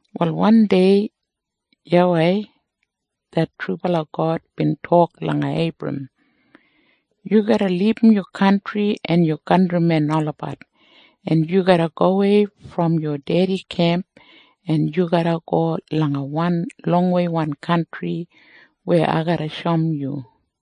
Wal wandei YAWEI det trubala God bin tok langa Eibram, “Yu garra libum yu kantri en yu kantrimen olabat, en yu garra gowei brom yu dedi kemp, en yu garra go langa wan longweiwan kantri weya ai garra shoum yu.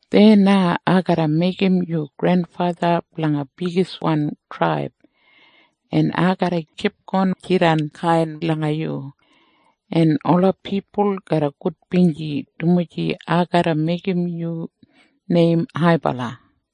Deya na ai garra meigim yu grenfatha blanga bigiswan traib, en ai garra kipgon jidan kainbala langa yu, en ola pipul garra gudbinji dumaji ai garra meigim yu neim haibala.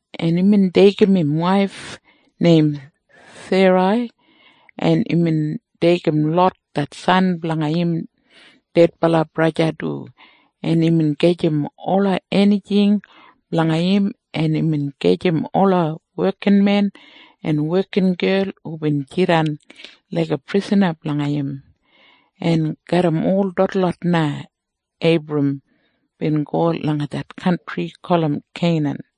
en imbin deigim im waif neim Serai, en imbin deigim Lot det san blanga im dedbala braja du, en imbin gajim ola enijing blanga im, en imbin gajim ola wekinmen en wekingel hubin jidan laiga prisana blanga im, en garram ol detlot na Eibram bin go langa det kantri gulum Keinan.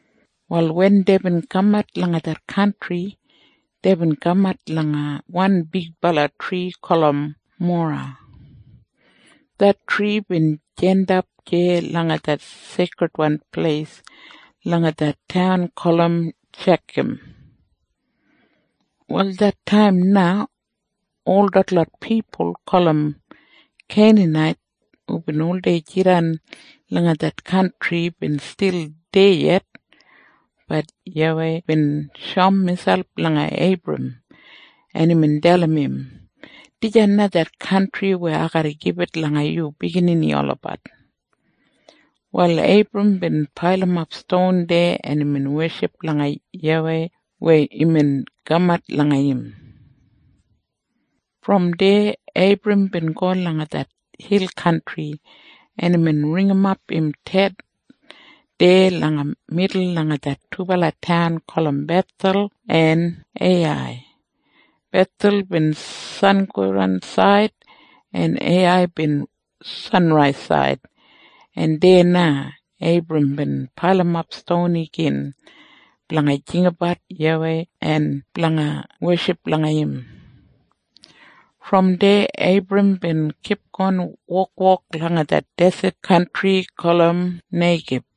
Wal wen deibin kamat langa det kantri, deibin kamat langa wan bigbala tri gulum Mora. Det tri bin jandap deya langa det seikridwan pleis langa det taun gulum Shekam. Wal det taim na ol detlot pipul gulum Keinanait hubin oldei jidan langa det kantri bin stil deya yet. Bat YAWEI bin shoum miselp langa Eibram, en imbin dalim im, “Dijan na det kantri weya ai garra gibit langa yu biginini olabat.” Wal Eibram bin pailimap ston deya, en imbin weship langa YAWEI weya imbin kamat langa im. Brom deya Eibram bin go langa det hil kantri, en imbin ringimap im tent deya langa midul langa det dubala taun gulum Bethel en Eiyai. Bethel bin sangodansaid, en Eiyai bin sanraisaid, en deya na Eibram bin pailimap ston igin blanga jinggabat YAWEI en blanga weship langa im. Brom deya Eibram bin kipgon wokwok langa det deset kantri gulum Neigib.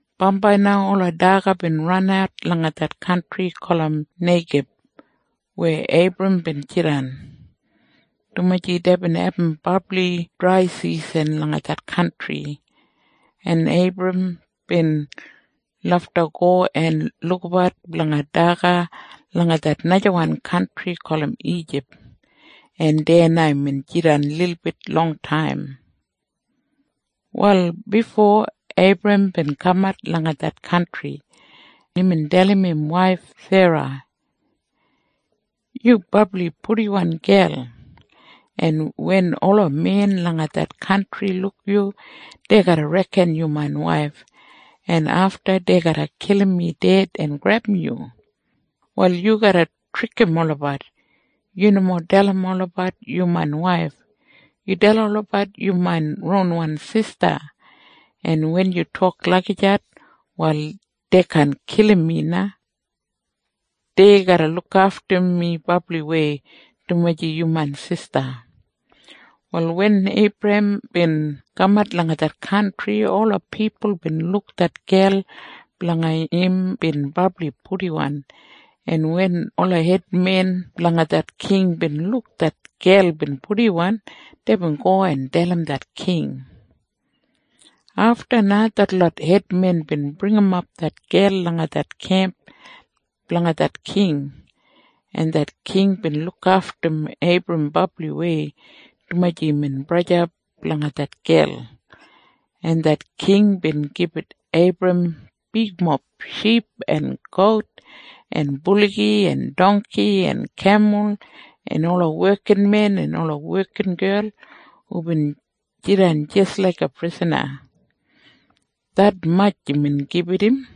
Bambai na ola daga bin ranat langa det kantri gulum Neigib weya Eibram bin jidan, dumaji deibin abum brabli draisisan langa det kantri, en Eibram bin lafta go en lukabat blanga daga langa det najawan kantri gulum Ijip, en deya na imbin jidan lilbit longtaim. Wal bifo Eibram bin kamat langa det kantri, imbin dalim im waif Serai, “Yu brabli purdiwan gel, en wen ola men langa det kantri luk yu, dei garra reken yu main waif, en afta dei garra kilim mi ded en grebum yu. Wal yu garra trikim olabat. Yu nomo dalim olabat yu main waif. Yu dalim olabat yu main ronwan sista. En wen yu tok lagijat, wal dei kaan kilim mi na. Dei garra lukaftum mi brabliwei, dumaji yu main sista.” Wal wen Eibram bin kamat langa det kantri, ola pipul bin luk det gel blanga im bin brabli purdiwan, en wen ola hedmen blanga det king bin luk det gel bin purdiwan, deibin go en dalim det king. Afta na detlot hedmen bin bringimap det gel langa det kemp blanga det king, en det king bin lukaftum Eibram brabliwei, dumaji imbin braja blanga det gel, en det king bin gibit Eibram bigmob ship en gout en buligi en dongki en kemul en ola wekinmen en wekingel hubin jidan jis laiga prisana. Detmatj imbin gibit im.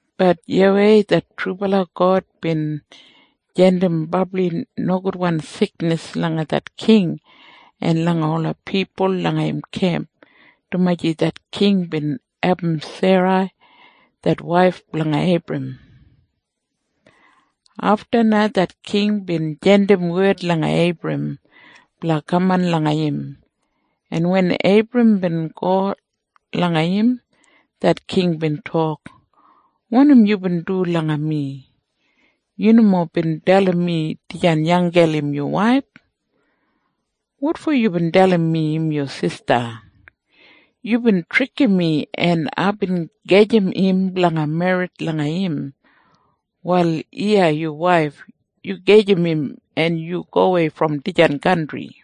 Bat YAWEI det trubala God bin jandim brabli nogudwan siknis langa det king en langa ola pipul langa im kemp, dumaji det king bin abum Serai det waif blanga Eibram. Afta na det king bin jandim wed langa Eibram blanga kaman langa im, en wen Eibram bin go langa im, det king bin tok, “Wanim yubin du langa mi? Yu nomo bin dalim mi dijan gel im yu waif. Wotfo yubin dalim mi im yu sista? Yubin trikim mi, en aibin gajim im blanga merrit langa im. Wal iya yu waif. Yu gajim im en yu gowei brom dijan kantri.”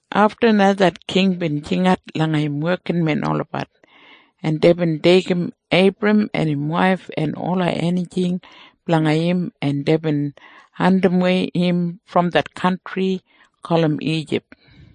Afta na det king bin jingat langa im wekinmen olabat, en deibin deigim Eibram en im waif en ola enijing blanga im, en deibin andimwei im brom det kantri gulum Ijip.